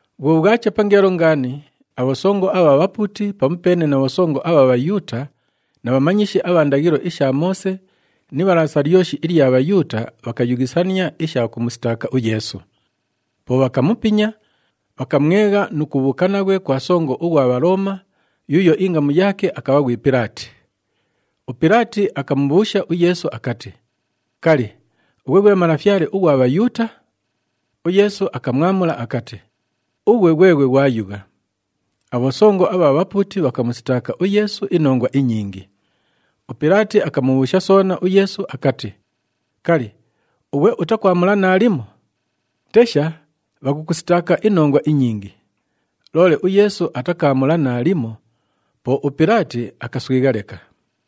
Bhwo bhwacha pangeelo ngaani, abhosongo abha bhapuuti pamupeene na bhosongo abha Bhayuuta na bhamanyishi abha ndaghilo isha Moose ni Ibhalaasa lyoshi ilya Bhayuuta bhakayughisania isha kumusitaaka uYeesu. Po bhakamupinya, bhakamwegha nu kubhuuka naghwe kwa songo ughwa Bhalooma, yuuyo ingamu yaake akabha ghwi Pilaati. UPilaati akamubhuusha uYeesu akati, “Kali, ughwe ghwe Malafyale ughwa Bhayuuta?” UYeesu akamwamula akati, “Ughwe ghweghwe ghwayugha.” Abhosongo abha bhapuuti bhakamusitaaka uYeesu inongwa inyingi. UPilaati akamubhuusha soona uYeesu akati, “Kali, ughwe utakwamula naalimo? Tesha, bhakukusitaaka inongwa inyingi!” Loole uYeesu atakaamula naalimo, po uPilaati akaswigha leka.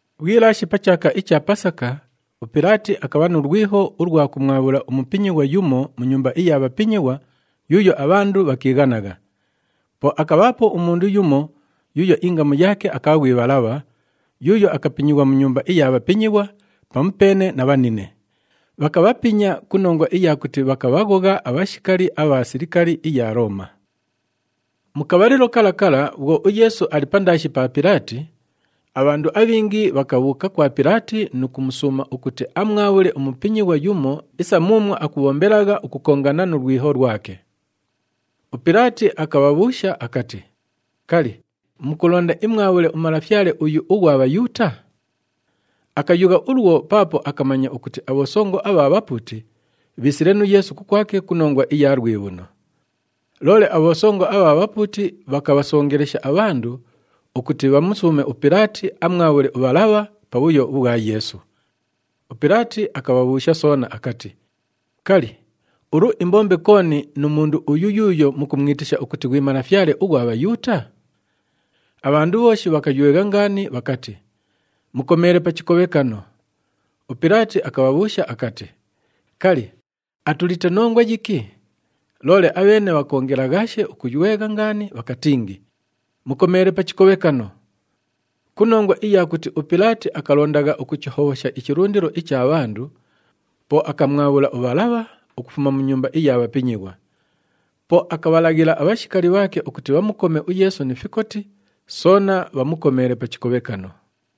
Bhwilaashe pa chaaka icha Pasaka, uPilaati akabha nu lwiho ulwa kumwabhula umupinyighwa yumo mu nyumba iya bhapinyighwa yuuyo abhandu bhakiighanagha. Po akabhaapo umundu yumo yuuyo ingamu yaake akabha ghwi Bhalabha yuuyo akapinyighwa mu nyumba iya bhapinyighwa pamupeene na bhanine. Bhakabhapinya ku nongwa iya kuti bhakabhaghogha abhashikali abha silikali iya Looma. Mu kabhalilo kala kala bhwo uYeesu ali pandaashi pa Pilaati, abhandu abhingi bhakabhuuka kwa Pilaati nu kumusuuma ukuti amwabhule umupinyighwa yumo isa muumwo akubhombelagha ukukongana nu lwiho lwake. UPilaati akabhabhuusha akati, “Kali, mukulonda imwabhule uMalafyale uyu ughwa Bhayuuta?” Akayugha ulwo paapo akamanya ukuti abhosongo abha bhapuuti bhiisile nu Yeesu kukwake ku nongwa iya lwibhuno. Loole abhosongo abha bhapuuti bhakabhasongelesha abhandu ukuti bhamusuume uPilaati amwabhule uBhalabha pa bhuyo ubhwa Yeesu. UPilaati akabhabhuusha soona akati, “Kali, ulu imbombe kooni nu mundu uyu yuuyo mukumwitisha ukuti ghwi Malafyale ughwa Bhayuuta?” Abhandu bhooshi bhakaywegha ngaani bhakati, “Mukomeele pa chikobhekano!” UPilaati akabhabhuusha akati, “Kali, atulite nongwa yiki?” Loole abheene bhakoongelaghaashe ukuywegha ngaani bhakatingi, “Mukomeele pa chikobhekano!” Ku nongwa iya kuti uPilaati akalondagha ukuchihobhosha ichilundilo icha bhandu, po akamwabhula uBhalabha ukufuma mu nyumba iya bhapinyighwa. Po akabhalaghila abhashikali bhaake ukuti bhamukome uYeesu ni fikoti, soona bhamukomeele pa chikobhekano.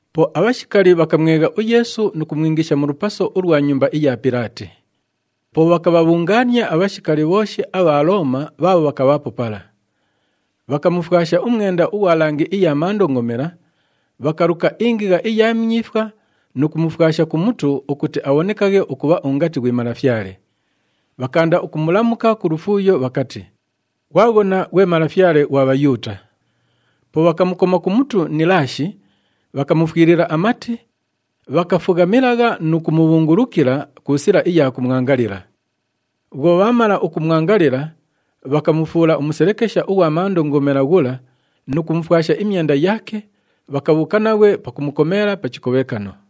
Po abhashikali bhakamwegha uYeesu nu kumwingisha mu lupaso ulwa nyumba iya Pilaati. Po bhakabhabhungaania abhashikali bhooshi abha Looma bhaabho bhakabhaapo pala. Bhakamufwasha umwenda ughwa langi iya mandongomela, bhakaluka ingigha iya myifwa nu kumufwasha ku mutu ukuti abhonekaghe ukubha ungati ghwi malafyale. Bhakaanda ukumulamuka ku lufuuyo bhakati, “Ghwaghona, ghwe Malafyale ghwa Bhayuuta!” Po bhakamukoma pa mutu ni ilaashi, bhakamufwilila amati, bhakafughamilagha nu kumubhungulukila ku sila iya kumwangalila. Bhwo bhaamala ukumwangalila, bhakamufuula umuselekesha ughwa mandongomela ghula nu kumufwasha imyenda yaake, bhakabhuuka naghwe pakumukomeela pa chikobhekano.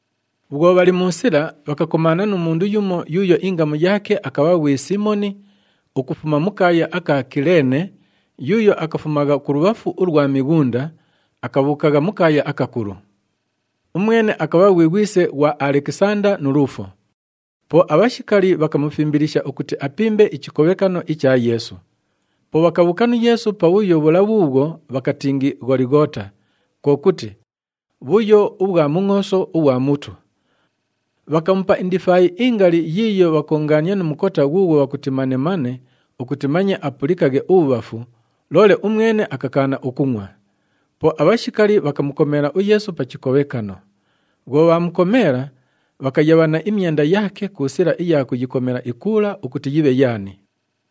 Bhwo bhali mu sila, bhakakomaana nu mundu yumo yuuyo ingamu yaake akabha ghwi Siimoni ukufuma mu kaaya aka Kileene yuuyo akafumagha kulubhafu ulwa mighunda, akabhuukagha mu kaaya akakulu. Umwene akabha ghwi ghwise ghwa Alekisanda nu Luufo. Po abhashikali bhakamufimbilisha ukuti apimbe ichikobhekano icha Yeesu. Po bhakabhuuka nu Yeesu pabhuyo bhula bhuubhwo bhakatingi Gholighoota, kwo kuti, “Bhuyo ubhwa Mungʼooso ughwa Mutu.” Bhakamupa indifaayi ingali yiiyo bhakoongaania nu mukota ghuughwo bhakuti manemane ukuti manye apulikaghe ubhubhafu, loole umwene akakaana ukungʼwa. Po abhashikali bhakamukomeela uYeesu pa chikobhekano. Bhwo bhaamukomeela, bhakayabhana imyenda yaake ku sila iya kuyikomela ikuula ukuti yibhe yaani.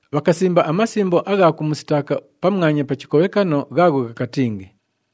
Bhakasimba amasimbo agha kumusitaaka pamwanya pa chikobhekano ghaagho ghakatingi,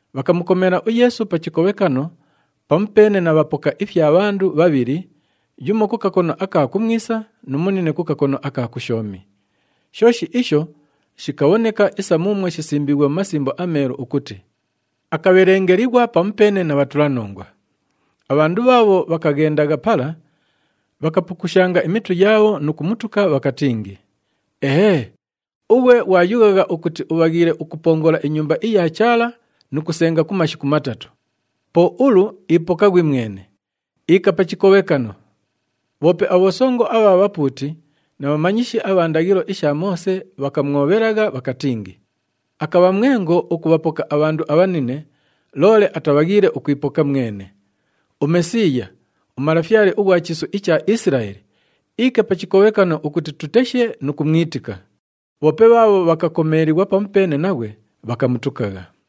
Bhakamukomeela uYeesu pa chikobhekano pamupeene na bhapoka ifya bhandu bhabhili, yumo ku kakono aka kumwisa nu munine ku kakono aka kushoomi. [ Shooshi isho shikabhoneka isa muumwo shisimbiighwe mu Masimbo aMeelu ukuti, “Akabhelengelighwa pamupeene na bhatulanongwa.”] Abhandu bhaabho bhakaghendagha pala, bhakapukushanga imitu yaabho nu kumutuka, bhakatingi, “Ehee! Ughwe ghwayughagha ukuti ubhaghiile ukupongola iNyumba iya Chaala nu kusenga ku mashiku matatu, po ulu ipoka ghwimwene. Iika pa chikobhekano!” Bhoope abhosongo abha bhapuuti na bhamanyishi abha ndaghilo isha Moose bhakamwobhelagha bhakatingi, “Akabha mwengo ukubhapoka abhandu abhanine, loole atabhaghiile ukwipoka mwene! UMesiiya, uMalafyale ughwa chiisu icha Isilaeli, iike pa chikobhekano ukuti tuteshe nu kumwitika!” Bhoope bhaabho bhakakomeelighwa pamupeene naghwe bhakamutukagha.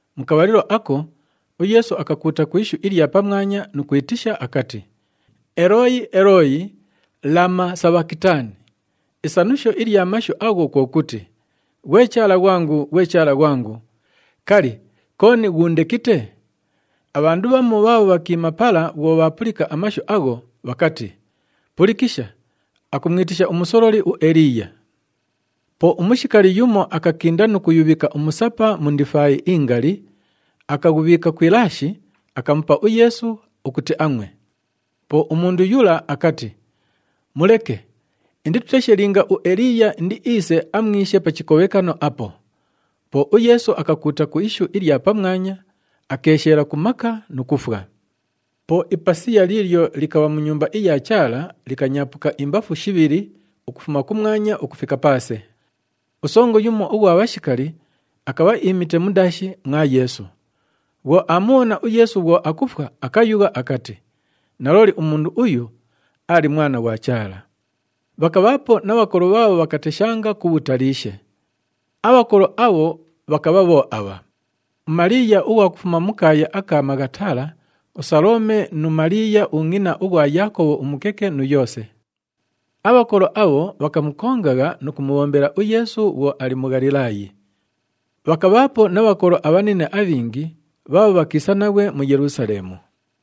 Mu kabhalilo ako, uYeesu akakuuta ku ishu ilya pamwanya nu kwitisha akati, “Elooyi! Elooyi! Lama sabhakitani?” Isanusho ilya mashu agho kwo kuti, “Ghwe Chaala ghwangu! Ghwe Chaala ghwangu! Kali, kooni ghuundekite?” Abhandu bhamu bhaabho bhakiima pala bhwo bhaapulika amashu agho, bhakati, “Pulikisha! Akumwitisha umusololi uEliiya.” Po umushikali yumo akakinda nu kuyubhika umusapa mu ndifaayi ingali, akaghubhiika ku ilaashi, akamupa uYeesu ukuti angʼwe. Po umundu yula akati, “Muleke, indituteshe linga uEliiya indiiise amwishe pa chikobhekano apo!” Po uYeesu akakuuta ku ishu ilya pamwanya, akeesheela ku maka nu kufwa. Po ipasiya liilyo likabha mu Nyumba iya Chaala likanyaapuka imbafu shibhili ukufuma kumwanya ukufika paase. Usongo yumo ughwa bhashikali akabha iimite mundaashi mwa Yeesu. Bhwo aamubhona uYeesu bhwo akufwa, akayugha akati, “Nalooli umundu uyu aali Mwana ghwa Chaala!” Bhakabhaapo na bhakolo bhaabho bhakateshanga ku bhutaliishe. Abhakolo abho bhakabha bho abha: uMaliiya ughwa kufuma mu kaaya aka Maghatala, uSalome nu Maliiya ungʼina ughwa Yaakobhu umukeke nu Yoose. Abhakolo abho bhakamukongagha nu kumubhombela uYeesu bhwo ali mu Ghalilaayi. Bhakabhaapo na bhakolo abhanine abhingi bhaabho bhakiisa naghwe mu Yelusaleemu.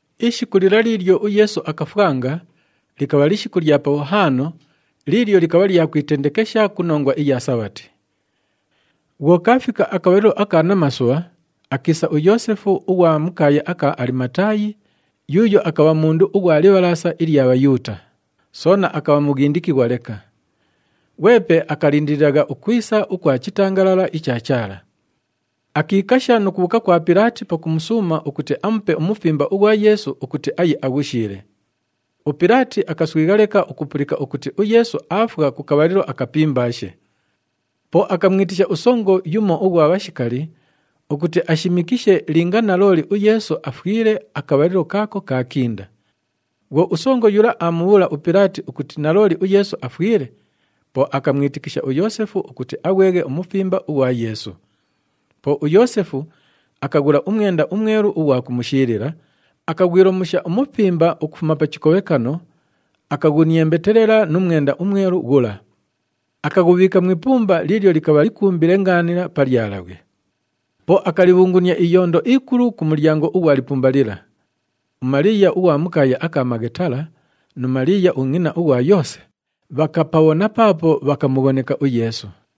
Ishiku lila liilyo uYeesu akafwanga likabha lishiku lya Pabhuhaano liilyo likabha lya kwitendekesha ku nongwa iya Sabhati. Bhwo kaafika akabhalilo aka namasubha, akiisa uYoosefu ughwa mu kaaya aka Alimataayi yuuyo akabha mundu ughwa Libhalaasa ilya Bhayuuta, soona akabha mughindikighwa leka. Ghwepe akalindililagha ukwisa ukwa chitangalala icha Chaala. Akiikasha nu kubhuuka kwa Pilaati pakumusuuma ukuti amupe umufimba ughwa Yeesu ukuti aye aghushiile. UPilaati akaswigha leka ukupulika ukuti uYeesu aafwa ku kabhalilo akapimbaashe. Po akamwitisha usongo yumo ughwa bhashikali ukuti ashimikishe linga nalooli uYeesu afwile akabhalilo kaako kaakinda. Bhwo usongo yula aamubhuula uPilaati ukuti nalooli uYeesu afwile, po akamwitikisha uYoosefu ukuti aghweghe umufimba ughwa Yeesu. Po uYoosefu akaghula umwenda umwelu ughwa kumushiilila, akaghwilomusha umufimba ukufuma pa chikobhekano, akaghuniembetelela nu mwenda umwelu ghula. Akaghubhiika mu ipumba liilyo likabha likumbile ngaanila pa lyalabhwe. Po akalibhungunia iyondo ikulu ku mulyango ughwa lipumba lila. UMaliiya ughwa mu kaaya aka Maghatala nu Maliiya ungʼina ughwa Yoose bhakapabhona paapo bhakamughoneka uYeesu.